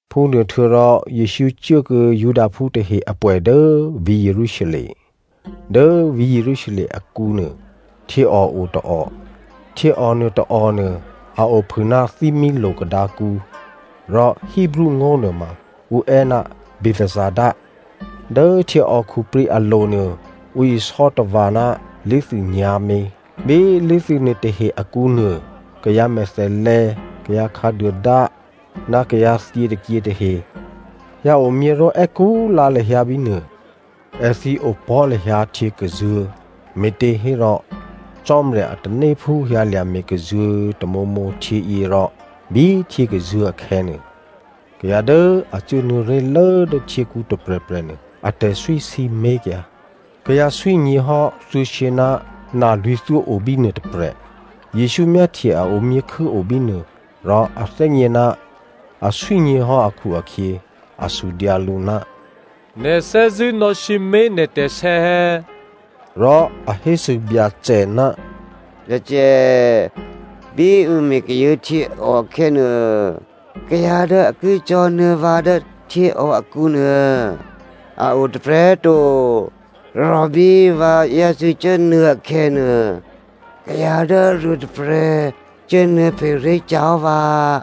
Phúnuôhtuô̌rò, Jesǔ cuốkuô̌ Judaphú tahe apwè̌ dố vǐ̤ Jerusalem. Dố vǐ̤ Jerusalem akǔnuô htyěò o tôò. Htyěò nuôtôò nuô a ophû ná Thímílo̤ Kadǎkǔ rò Hebreo ngó̤ nuôma ǔ è́ ná Bethesda. Dố htyěò khuprǐ alo̤nuô ǔ isò́ tava̤ ná lé̤thû nyǎ̤mě. Bí lé̤thû nuôtahe akǔnuô kayǎ mèthèlè̌, kayǎ khǎduôdá, ná kayǎ thyětôkyě tahe hyǎomyě ró̤ è́kú lǎ lahyǎ bínuô. (Èthǐ opò̤́ lahyǎ htyěkazuô̤̌ me̤těhérò Cò́marya a tanéphú hyǎlya̤ me̤kazuô̤̌ tamǒmǒ htyěyě rò bí htyě kazuô̤̌ akhè̌nuô, kayǎ dố a cuốnuô̌ ré̤lố dố htyěkǔ tôprè̤prè̤ nuô, atè̤swí sǐmé̤kyǎ.) Kayǎ swí nyě̤hò́ thuô̌shyě ná nalwǐ̤thyó obínuô tôprè̤. Jesǔ myáhtye a omyěkhû́o bínuô rò a thè́gně ná aswí nyě̤hò́ akhu-akhyě a sudyǎ lǔ, “Nè̤ thè́zṳ̂́ nò̌sǐmé̤ nè̤ tè̤sè̌ è̌?” Rò a hésû Byacè, “Byacè꤮, bí ǔ me̤ kazuô̤̌ htyěò akhè̌nuô, kayǎ dố a ki cò̤̌nuô̌ vǎ dố htyěò akǔnuô a o tôprè̤꤮ to. Rò bí vǎ yácû́ cuốnuô̌ akhè̌nuô, kayǎ dố aruôtôprè̤ cuốnuô̌phe ré̤kyǎ hò́ vǎ.”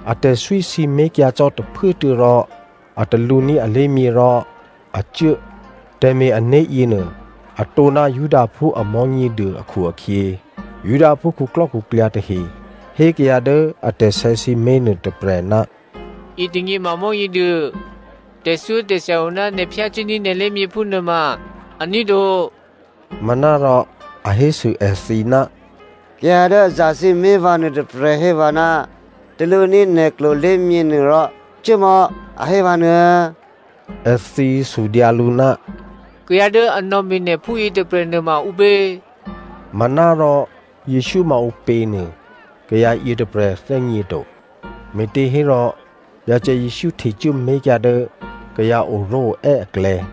Atè̤swí sǐmé̤kyǎ cò́ tôphuốtuô̌ rò a talǔní̤ alé̤myě rò a cuố. Tè̤me̤-ané̤ yěnuô atǒ ná Judaphú a Mò̤́nyěduô akhu-akhyě, Judaphú khuklò́khuklyǎ tahe hé kayǎ dố atè̤sè̌ sǐmé̤ nuôtôprè̤, “Yětônyě ma Mò̤́nyěduô. Tè̤thyótè̤thya o ná nè̤ phyácuốní̤ nè̤ lé̤myě phúnuô ma aní̤ to.” Manárò a hésû èthǐ, “Kayǎ dố a zasǐmé̤ vǎ nuôtôprè̤ hé vǎ, ‘Talǔní̤ nè̤ klolé̤myě nuô rò cuốmò̌,’ a hé vǎ nuô̌꤮.” Èthǐ sudyǎ lǔ, “Kayǎ dố a nò̌me̤ nè̤ phúyě tôprè̤nuô ma ǔpě?” Manárò Jesǔ ma ǔpě nuô kayǎ yětôprè̤ thè́gněto, me̤těhérò Byacè Jesǔ htecuố mé̤kyǎ dố kayǎ oró̤oè́ aklè̌.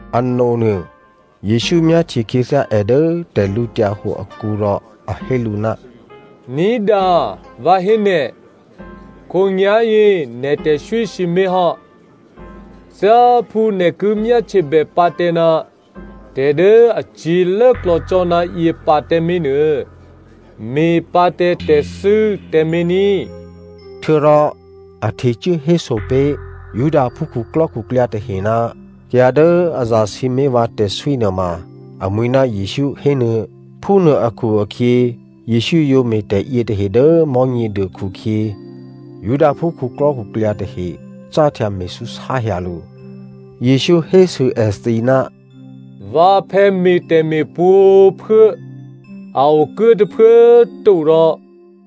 Anonuô, Jesǔ myáhtye khyěthyá è dố tè̤lǔhǒdu akǔ rò a hé lǔ, “Ní̤dǎ, vǎ hé nè̤, khǒnyá̤yě nè̤ tè̤swí sǐmé̤hò́. Thyáphú nè̤ ki myáhtyebè pǎ tǎ ná tè̤ dố acyě̤ lốklò̌ cò́ ná yě pǎ tǎmé̤nuô me̤pǎ tǎ tè̤thû́ tǎmé̤ ní꤮.” Htuô̌rò a htecuố héso pé̤ Judaphú khuklò́khuklyǎ tahe ná kayǎ dố a zasǐmé̤ vǎ tè̤swí nuôma amwi̤ ná Jesǔ hénuô̌꤮. Phúnuô akhu-akhyě, Jesǔ yǒ me̤ tè̤yětahe dố Mò̤́nyěduô khukhyě, Judaphú khuklò́khuklyǎ tahe cáhtya me̤súsáhyǎ lǔ. Jesǔ hésû èthǐ, “Vǎphè̌ me̤ tè̤me̤ pwǒ̤꤮ phuố, a okuố tôphuố꤮ to rò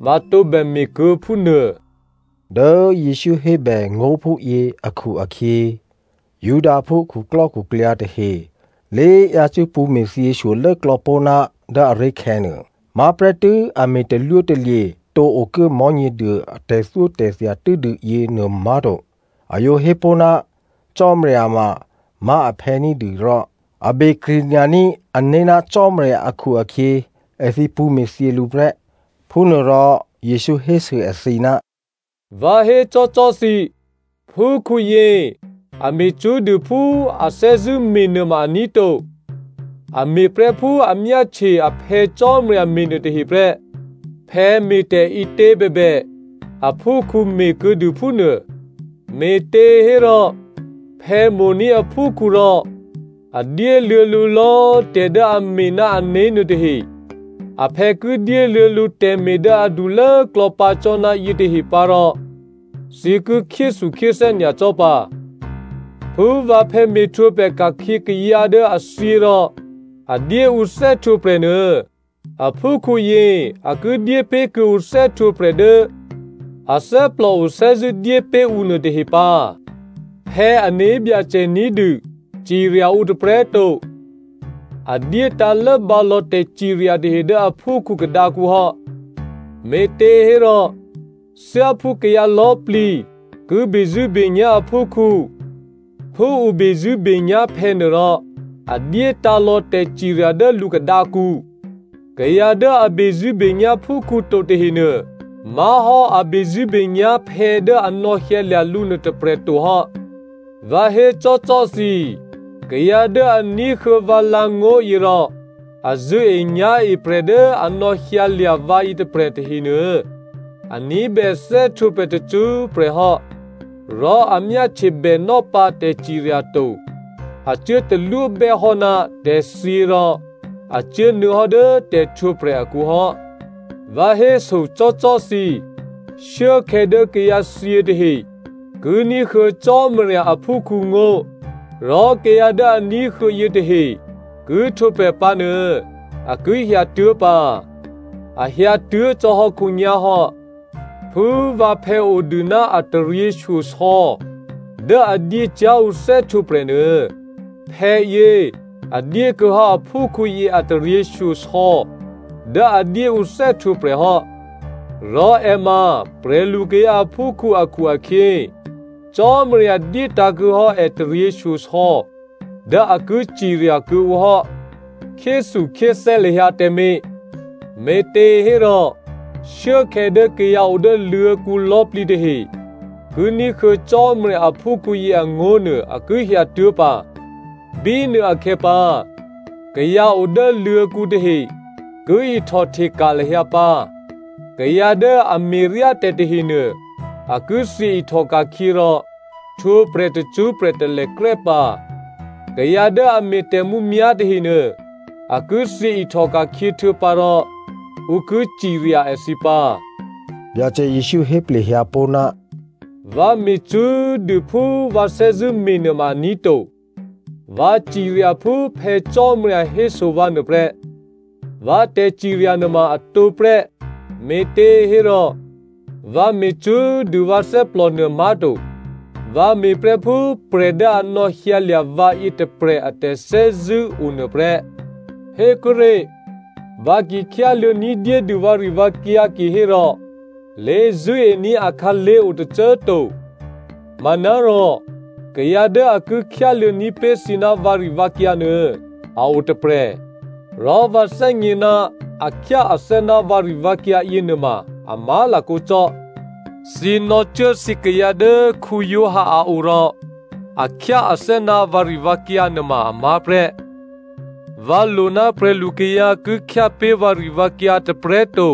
vǎ tǒbè me̤kuô̌ phúnuô.” Dố Jesǔ hébè ngó̤ phúyě akhu-akhyě Judaphú khuklò́khuklyǎ tahe lé yácû́ pṳ̌me̤thyě shyolốklò̌ pó̤ ná dố aré̤khè̌ nuô. Má̤ prè́tû́ a me̤ talwótalye̤ tǒ okuố Mò̤́nyěduô a tè̤thyótè̤thya tû́dû yěnuô má̤to, a yǒ hé pó̤ ná Cò́marya mamá̤ aphè̌ ní̤dû rò a be krṳ̂nya̤ní̤ ané̤ ná Cò́marya akhu-akhyě èthǐ pṳ̌ me̤thyě lǔ prè́. Phúnuôrò, Jesǔ hésû èthǐ, “Vǎ hécò́cò́ thǐ, phúkhǔyě a me̤ cṳ́꤮ dû phú a thè́zṳ̂́me̤ nuôma aní̤ to. A me̤prè́ phú a myáhtye a Phè̌ Cò́marya me̤nuô tahe prè́. Phè̌ me̤tè̤ ǐtě bèbè, a phúkhǔ me̤ kuô̌dû phúnuô. Me̤těhérò, phè̌ mo̤ní̤ aphúkhǔ rò a dyéluô̌ lǔ lò̌꤮ tè̤ dố a me̤ ná ané̤ nuôtahe. Aphè̌ ki dyéluô̌ lǔ tè̤me̤ dố adulốklò̌ pǎ cò́ ná yětahe pǎ rò thǐ ki khyéthukhyéthè́ nyacò́ pǎ. Phú vǎphè̌ me̤htwǒprè̤ ka̤khyě kayǎ dố a thyě rò a dyé ǔ thè́htwǒprè̤ nuô, aphúkhǔyě a ki dyépé̤ kuô̌ǔ thè́htwǒprè̤ dố a thè́plòo thè́zṳ̂́ dyé pé̤ ǔ nuôtahe pǎ. Phè̌ ané̤byacè ní̤dû cirya ǔ tôprè̤꤮ to. A dyétǎ̤ lốbǎ lò̌ tè̤cirya tahe dố aphúkhǔ khadǎkǔ hò́. Me̤těhérò, thyáphú kayǎ lò̌꤮ plǐ ki bezṳ̂́benyá̤ aphúkhǔ phú ǔ bezṳ̂́benyá̤ phè̌nuô rò a dyétǎ̤ lò̌ tè̤cirya dố lǔ khadǎkǔ. Kayǎ dố a bezṳ̂́benyá̤ phúkhǔ to tahenuô, má̤hò́ a bezṳ̂́benyá̤ phè̌ dố a nò̌hyǎlya̤ lǔ nuôtôprè̤ to hò́. “Vǎ hécò́cò́ thǐ, kayǎ dố a ní̤huô̌ vǎ lǎ̤ngó̤ yěrò a zṳ̂́enyá̤e prè̤ dố a nò̌hyǎlya̤ vǎ yětôprè̤ tahenuô, a ní̤bè thè́htwǒprè̤ tacṳ́prè̤ hò́. Rò a myáhtye bènò́pǎ tè̤cirya to. A cuố talwóbè́ hò́ ná tè̤thyě rò a cuốnuô̌ hò́ dố tè̤htwǒprè̤ akǔ hò́. Vǎ hésocò́cò́ thǐ, shuốkhè̌ dố kayǎthyě tahe ki ní̤huô̌ Cò́marya aphúkhǔ ngó̤, rò kayǎ dố a ní̤huô̌ yětahe ki htwǒprè̤ pǎ nuô, a ki hyǎtuố̤ pǎ. A hyǎtuố̤ cò́hò́ khǒnyá̤ hò́. Phú vǎphè̌ odû ná a taryěshyosò̌ dố a dyé cyá̤ ǔ thè́htwǒprè̤ nuô, phè̌yě a dyé kuô̌hò́ aphúkhǔyě a taryěshyosò̌ dố a dyé ǔ thè́htwǒprè̤ hò́. Rò è ma prè̤lukayǎ aphúkhǔ akhu-akhyě, Cò́marya dyétǎ̤kuô̌ hò́ è taryěshyosò̌ dố a ki cirya kuô̌ǔ hò́. “Khyéthukhyéthè́ lahyǎ tǎmé̤, me̤těhérò shuốkhè̌ dố kayǎ odố luô̤̌kǔ lò̌꤮ plǐ tahe ki ní̤huô̌ Cò́marya aphúkhǔyě angó̤nuô a ki hyǎtuố̤ pǎ. Bínuôakhè̌ pǎ, kayǎ o dố luô̤̌kǔ tahe ki ihtòhteka̤ lahyǎ pǎ. Kayǎ dố a me̤ryá tè̤ tahenuô a ki thyě ihtòka̤khyě rò htwǒprè̤ tacṳ́prè̤ talèkrè́ pǎ. Kayǎ dố a me̤ tè̤mǔmyá̤ tahenuô, a ki thyě ihtòka̤khyě htuô̌pǎ rò ǔ ki cirya èthǐ pǎ.” Byacè Jesǔ héplehyǎ pó̤, “Vǎ me̤ cṳ́꤮ dû phú vǎ thè́zṳ̂́ me̤ nuôma aní̤ to. Vǎ cirya phú Phè̌ Cò́marya héso vǎ nuô prè́. Vǎ tè̤cirya nuôma atǒ prè́, me̤těhérò vǎ me̤ cṳ́꤮ dû vǎ thè́plònuô má̤to. Vǎ me̤prè́ phú prè̤ dố a nò̌hyǎlya̤ vǎ yětôprè̤ a tè̤thè́zṳ̂́ o nuôprè́. “Hékuốré̤, vǎ ki khyáluô̌ ní̤dyédû vǎrivǎkyǎ kihérò lé̤zṳ̂́ení̤ akhǎlé̤ o tôcô꤮ to. Manárò kayǎ dố a ki khyáluô̌ní̤ pé̤ thǐ ná vǎrivǎkyǎ nuô, a o tôprè̤. Rò vǎ thè́gně ná a khyáathè́ ná vǎrivǎkyǎ yěnuôma a má̤lakǒ cò́. “Thǐ nò̌cuố thǐkayǎ dố Giovanni a o rò a khyáathè́ ná vǎrivǎkyǎ nuôma amá̤ prè́. Vǎ lo ná prè̤lukayǎ ki khyápé̤ vǎrivǎkyǎ tôprè̤꤮ to.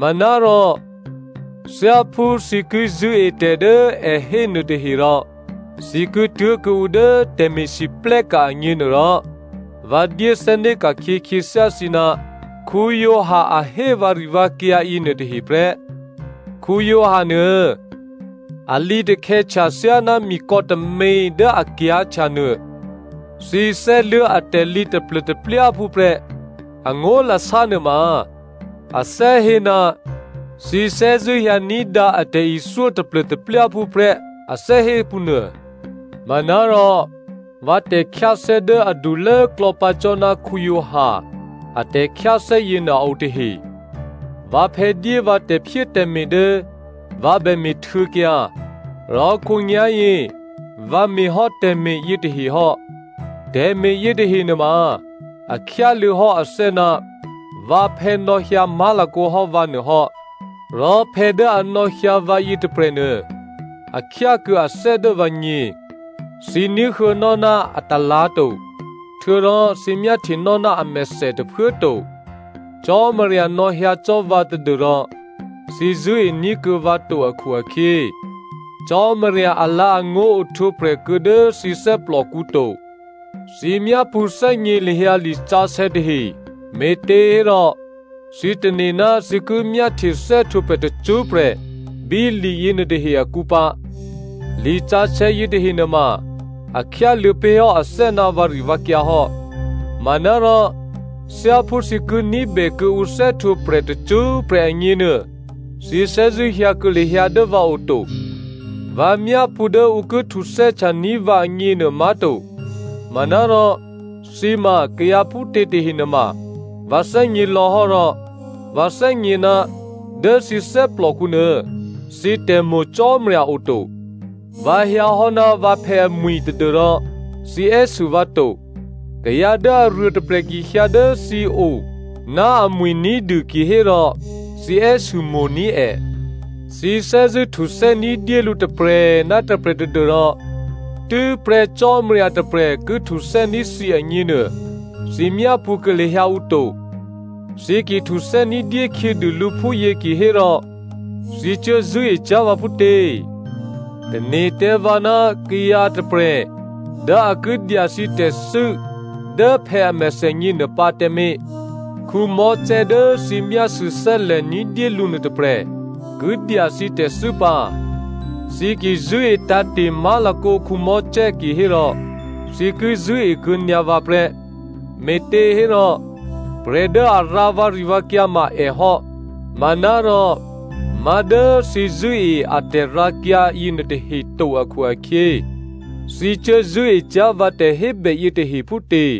Manárò thyáphú thǐ ki zṳ̂́e tè̤ dố è hé nuôtahe rò thǐ ki tuố̤kuô̌ǔ dố tè̤me̤lwóhteka̤ agněnuôrò, vǎ dyé thè́né̤ ka̤khyě khyěthyá thǐ ná Giovanni a hé vǎrivǎkyǎ yěnuôtahe prè́. Giovanni nuô a lǐtakhè̌htya thyáná mikò̌ tômě dố a kyǎ̤htya nuô. Thǐ thè́luố̤ atè̤lǐ taplô̤taplyáphú prè́, angó̤lasá nuôma, a thè́hé ná thǐ thè́zṳ̂́ hyǎ ní̤dǎ a tè̤ithyó taplô̤taplyáphú prè́ a thè́hé phúnuô. “Manárò vǎ tè̤khyáthè́ dố adulốklò̌ pǎ cò́ ná Giovanni a tè̤khyáthè́ yěnuô a o tahe. Vǎphè̌ dyé vǎ tè̤phyétè̤me̤ dố vǎ bè me̤htuô̌kyǎ, rò khǒnyá̤yě vǎ me̤ hò́ tè̤me̤ yětahe hò́. Tè̤me̤ yětahe nuôma, a khyáluô̌ hò́ athè́ ná vǎphè̌ nò̌hyǎ má̤lakǒ hò́ vǎ nuô hò́. Rò phè̌ dố a nò̌hyǎ vǎ yětôprè̤nuô, a khyákuô̌ athè́ dố vǎgně. Thǐ ní̤huô̌nò́ ná atalǎ̤ to, htuô̌rò thǐ myáhtyenò́ ná amèthè tôphuố꤮ to. Cò́marya nò̌hyǎ cò́ vǎ tadû́rò thǐ zṳ̂́ení̤ kuô̌ vǎ to akhu-akhyě, Cò́marya alǎ̤angó̤ ohtwǒprè̤ kuô̌ dố thǐ thè́plòkǔ to. Thǐ myápṳ̌thè́gně lahyǎ lisǎsè̌ tahe me̤těhérò thǐ tane̤ ná thǐ ki myáhtye thè́htwǒprè̤ tacṳ́prè̤ bí li yěnuôtahe akǔ pǎ. Lisǎsè̌ yětahe nuôma a khyáluô̌ pé̤hò́ athè́ ná vǎrivǎkyǎ hò́. Manárò thyáphú thǐ ki ní̤bè kuô̌ǔ thè́htwǒprè̤ tacṳ́prè̤ agněnuô, thǐ thè́zṳ̂́ hyǎ kuô̌ lahyǎ dố vǎo to. “Vǎ myápṳ̌ dố ǔ ki htuthè́htyaní̤ vǎ agněnuô má̤to. Manárò thǐ ma kayǎ phútě tahe nuôma vǎ thè́gně lò̌hò́ rò vǎ thè́gně, dố thǐ thè́plòkǔnuô, thǐ tè̤mo̤ Cò́marya oto. Vǎ hyǎhò́ ná vǎphè̌ amwi̤ tadû́rò thǐ è́sû vǎ to. Kayǎ dố aruôtôprè̤ ki hyǎ dố thǐo ná amwi̤ ní̤dû kihérò, thǐ è́sû mo̤ní̤ è. Thǐ thè́zṳ̂́ htuthè́ ní̤dyé lǔ tôprè̤ ná tôprè̤ tadû́rò tû́prè́ Cò́marya tôprè̤ ki htuthè́ní̤ thǐ agněnuô, thǐ myápṳ̌ kuô̌ lahyǎ ǔ to. Thǐ ki htuthè́ ní̤dyé khyědû lǔ phúyě kihérò thǐ cuố zṳ̂́e cyá̤ vǎ phútě? “Tane̤ tǎ vǎ ná kayǎ tôprè̤ dố a ki dya thǐ tè̤thû́ dố phè̌ a mèthènyě nuôpǎ tǎmé̤. Mosè dố thǐ myásû̌ thè́lè̤ ní̤dyé lǔ nuôtôprè̤, ki dya thǐ tè̤thû́ pǎ. Thǐ ki zṳ̂́e tǎ̤te̤ má̤lakǒ Mosè kihérò, thǐ ki zṳ̂́ekuô̌ nyǎ vǎ prè́, me̤těhérò prè̤ dố a rǎ vǎrivǎkyǎ ma è hò́. Manárò, má̤ dố thǐ zṳ̂́e a tè̤rǎkyǎ yěnuôtahe to akhu-akhyě, thǐ cuố zṳ̂́e cyá̤ vǎ tè̤hébè yětahe phútě?”